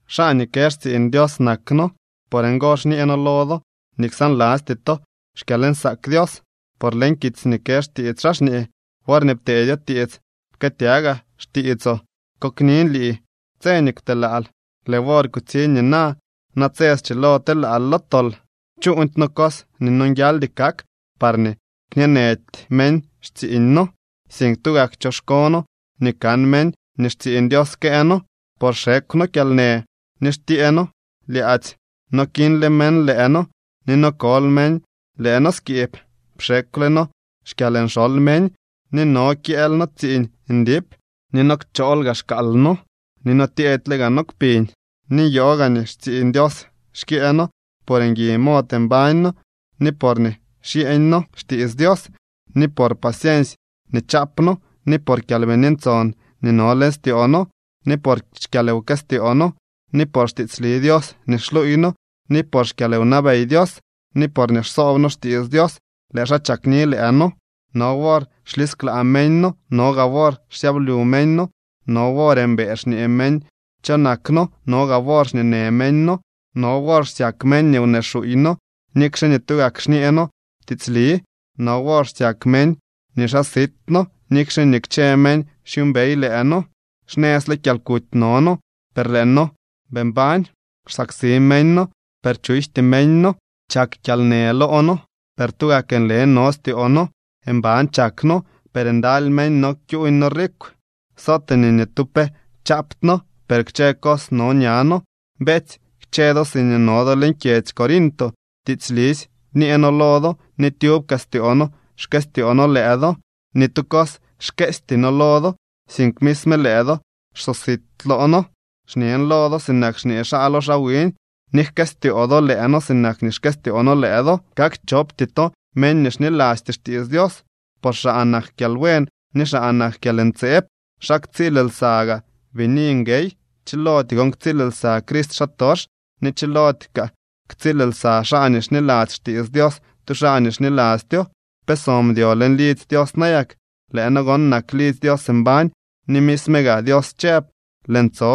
Xaa nii kë xtsiiñ Dios nak noo. Por ngo xñee noo lo do nii ksaanlasty to xkyalnsaak Dios. Por leñ kitsy nii kë xtiits xaa xñee: Worñee pteedyo tiits pkëëtyagaa xtiitsoo, koknin lii tse nii kwtelaal. Lëë wor kutsiñ nina. Natse schilo telaal lo tol. Chuuñdy noo cos nii nonguialdy kak parñee kñeenëdy meñ xtsiiñ noo, sink tugak choxko noo nii kan meñ nii xtsiiñ Dios këë noo, por xekw noo kyalnë, ni xtyee noo lyaadzy. No kiñle meñ lëë noo ni no kol meñ lëë noo skiib, pxekwle noo xkyalnxoly meñ ni no kyëël noo tsiiñ ndip, ni no kchool xkaal noo ni no tyeedyle gaa noo kpiñ. Ni nyoo gaa nii xtsiiñ Dios xkyëë noo por ngui mod mbañ noo, ni porñee xyeeñ noo xtiits Dios ni por paciensy nii chaap noo, ni por Kyalbini Ntson nii no leñ styoo noo ni por xkyalwkëstyoo noo, ni por xtiitsli Dios nii xluuy noo ni por xkyalwnabey Dios, ni porñee xsoob noo xtiits Dios, lëë xaa chakni lëë noo. No wor xlisklaa meñ noo, no gaa wor xsyablyu meñ noo. No wor mbëë xñee meñ cho nak noo, no gaa wor xñeenë meñ noo. No wor xsyak meñ nii wnee xuuy noo nikxe nii tugak xñee noo tiitsli. No wor xsyak meñ nii xaa sit noo, nikxe nii kchë meñ xyuumbey lëë noo. Xnëzle kyalkuty no noo, per lëë noo bii mbañ. Xsaksi meñ noo, per chujty meñ noo. Chak kyalnë loo noo, per tugak nle no styoo noo. Mban chak noo, per ndaly meñ no kyuuñ noo rikw. Sootee nii ni tu pe chaapty noo, per kchë cos no ña noo. Beetsy, kchë do siñee no do leñ kyedzy Corinto, tiitslisy bñee noo lo do ni tyub kaa styoo noo xkëstyoo noo lëë do. Ni tu cos xkeesty noo lo do, sink misme lëë do xsosit loo noo. Xñen lo do sinak xñee xaa lo xiñ, nii jkëstyoo do lëë noo sinak nii xkëstyoo noo lëë do. Kak chopty to meñ nii xnilasty xtiits Dios, por xaa nak kyalbuen ni xaa nak kyalntseeb. ¿Xa ktsiil lsa gaa bini nguey? Chilody gon ktsiil lsa Crist xaatox, ni chiloody kaa ktsiil lsa xaa nii xniladzy xtiits Dios tu xaa nii xnilastyo. ¿Pe so mdyo leñ lidzy Dios nayak? Lëë no gon nak lidzy Dios mbañ ni misme gaa Dios chëb: Lëën tso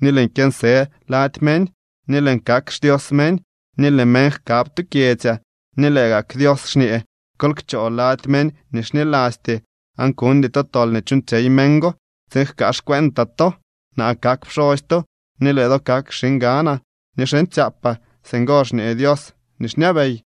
ni lëën kyënsë lady meñ, ni lëën kak xDios meñ, ni lëë meñ jkab tu kyedzyaa. Ni lëë gak Dios xñee: Kol kchoo lady meñ nii xnilasty, aan kuñdy to tol nii chuuñtsyey meñ go, tsiin jkaa xcuentaa to. Naa kak pxosy to ni lëë do kak xiñganaa ni xiñtsyaapaa. Singo xñee Dios nii xñabey.